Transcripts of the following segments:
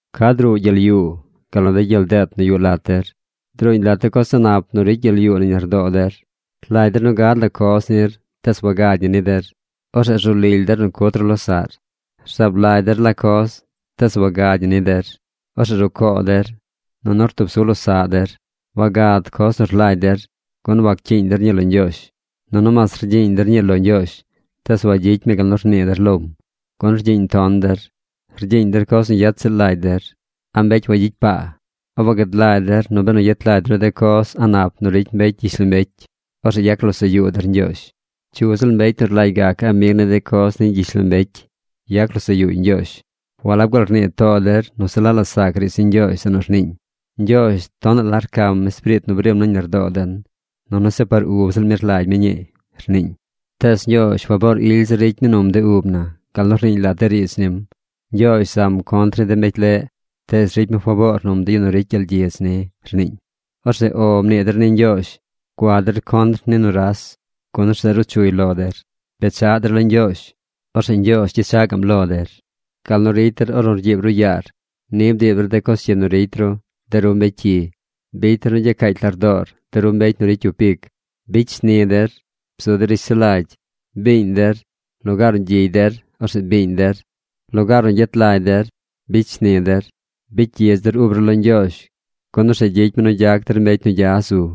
¿Ca druu de gyel yuu, gal nu de gyel deet nu yuꞌ lat der? Druuñ lat de coz a̱ꞌ nap nu ricy gyel yuu nañ lardoo der. Rlagy der nu gad la coz nir, tees wagad ñi ni der. Orzeꞌ rzu lily der nu cut ru losaꞌr. Rzaab lagy der la coz, tees wagad ñi ni der. Orzeꞌ rucoo der, nunu rtub su losaꞌ der. Wagad coz nu rlagy der, gun wacyiiñ der ñii lo Ñgyoozh. Nunu mas rgyiiñ der ñii lo Ñgyoozh, tees wagyicy mi gal nu rnii der lom, gun rgyiiñ ton der. Rgyiiñ der coz nu yet ziꞌl lagy der. ¡A̱ mbecy wagyicy paa! ¿A wagad lagy der nu benu yet lagy ru de coz a̱ꞌ nap nu ricy mbecy ni gyishlombecy, orzeꞌ yac losaꞌ yuu der Ñgyoozh? Cyu ziꞌl mbecy nu rlagy gac amig ni de coz ni gyishlombecy, yac losaꞌ yuuy Ñgyoozh. ¿Walab gaal rnii too der nu se la la sac riidz ni Ñgyoozh zeꞌ nu rniiñ: “Ñgyoozh tonaꞌ la rcam espiriit nu brim nañ lardoo den, nunu se par ub ziꞌl mi rlagy mi ñii”, rniiñ? Tees Ñgyoozh faboor ily zir ricy num de ub na gal nu rniiñ lat de riidz nim: “Ñgyoozh zam contr ni de mbecy leꞌ, tees ricy mi faboor num de yu nu ricy gyel gyidz ni”, rniiñ. Orzeꞌ “O” mnii der ni Ñgyoozh. Gua der contr ni nuras, gun orzeꞌ ruu chuy lo der. Bechaꞌ der lo Ñgyoozh. Orzeꞌ Ñgyoozh gyechaꞌ gaꞌm lo der. Gal nu ricy der ornu rgyiib ru yaar, ni bdiib der de coz cyi nu ricy ru, de ru mbecy cyi. ¡Bicy der nu gyacaacy lardoor, de ru mbecy nu ricy cyup ic! ¡Bicy shni der! ¡Bzu der rishsulagy! ¡Biiñ der! ¡Lugaar nu gyigy der, orzeꞌ biiñ der! ¡Lugaar nu yet lagy der, bicy shni der! Bicy gyidz der ub ru lo Ñgyoozh, gun orzeꞌ gyicy mi nu gyac der mbecy nu gya zu.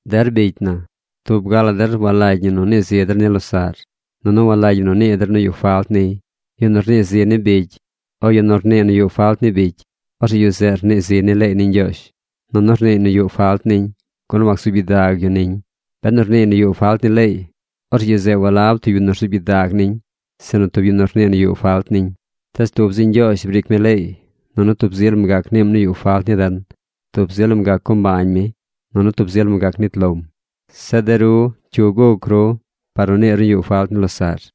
Der bicy na, tub ga la der walagy ñi nu nii zi der ni losaꞌr. Nunu walagy ñi nu nii der nu yuꞌ falt niy. Yu nu rnii zi ni bicy o yu nu rnii nu yuꞌ falt ni bicy, orzeꞌ yu zeꞌ rnii ziy ni leey ni Ñgyoozh, nunu rniiy nu yuꞌ falt niñ, gun wacsuub gyidag yu niñ. Benu rniiy nu yuꞌ falt ni leey, orzeꞌ yu zeꞌ walab tub yu nu rzuub gyidag niñ, sinu tub yu nu rnii nu yuꞌ falt niñ. Tees tub zi Ñgyoozh briic mi leey, nunu tub zi lam gac niim nu yuꞌ falt ni den. Tub zi lam gac co mbañ mi, nunu tub zi lam gac nit lom. Zeꞌ de ru, ¿cyu guc ru par nu niir nu yuꞌ falt ni losaꞌr?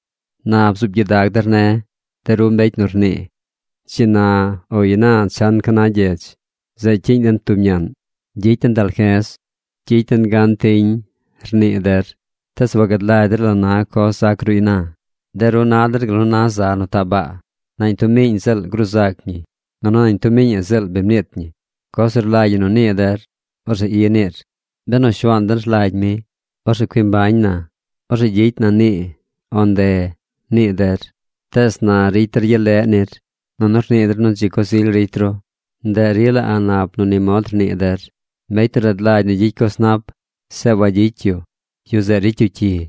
Na bzuub gyidag der ne̱, de ru mbecy nu rnii: “Dzi na o ina chan ca na gyedz. Zeꞌ cyiiñ den tub ñaꞌn. Gyicy den dalje̱z. Gyicy den gan tiñ”, rnii der. Tees wagad lagy der la coz zac ru ina. De ru na der gal nu na za nu taꞌ baa. Nañ tub miiñ ziꞌl gruu zac ñi nunu nañ tub miiñaꞌ ziꞌl bi mniit ñi. Coz nu rlagy ñi nu nii der, orzeꞌ i niir: “Benu Shuaan den rlagy mi, orzeꞌ cui mbañ na. Orzeꞌ gyicy na nii o nde”, nii der. Tees na ricy der gyel leꞌ nir, nunu rnii der nu dzi coz ily ricy ru. Ndeꞌ rila a̱ꞌ nap nu ni mod rnii der. Mbecy nu rad lagy nu gyicy coz nap, zeꞌ wagyicy yu, yu zeꞌ ricy yu cyi.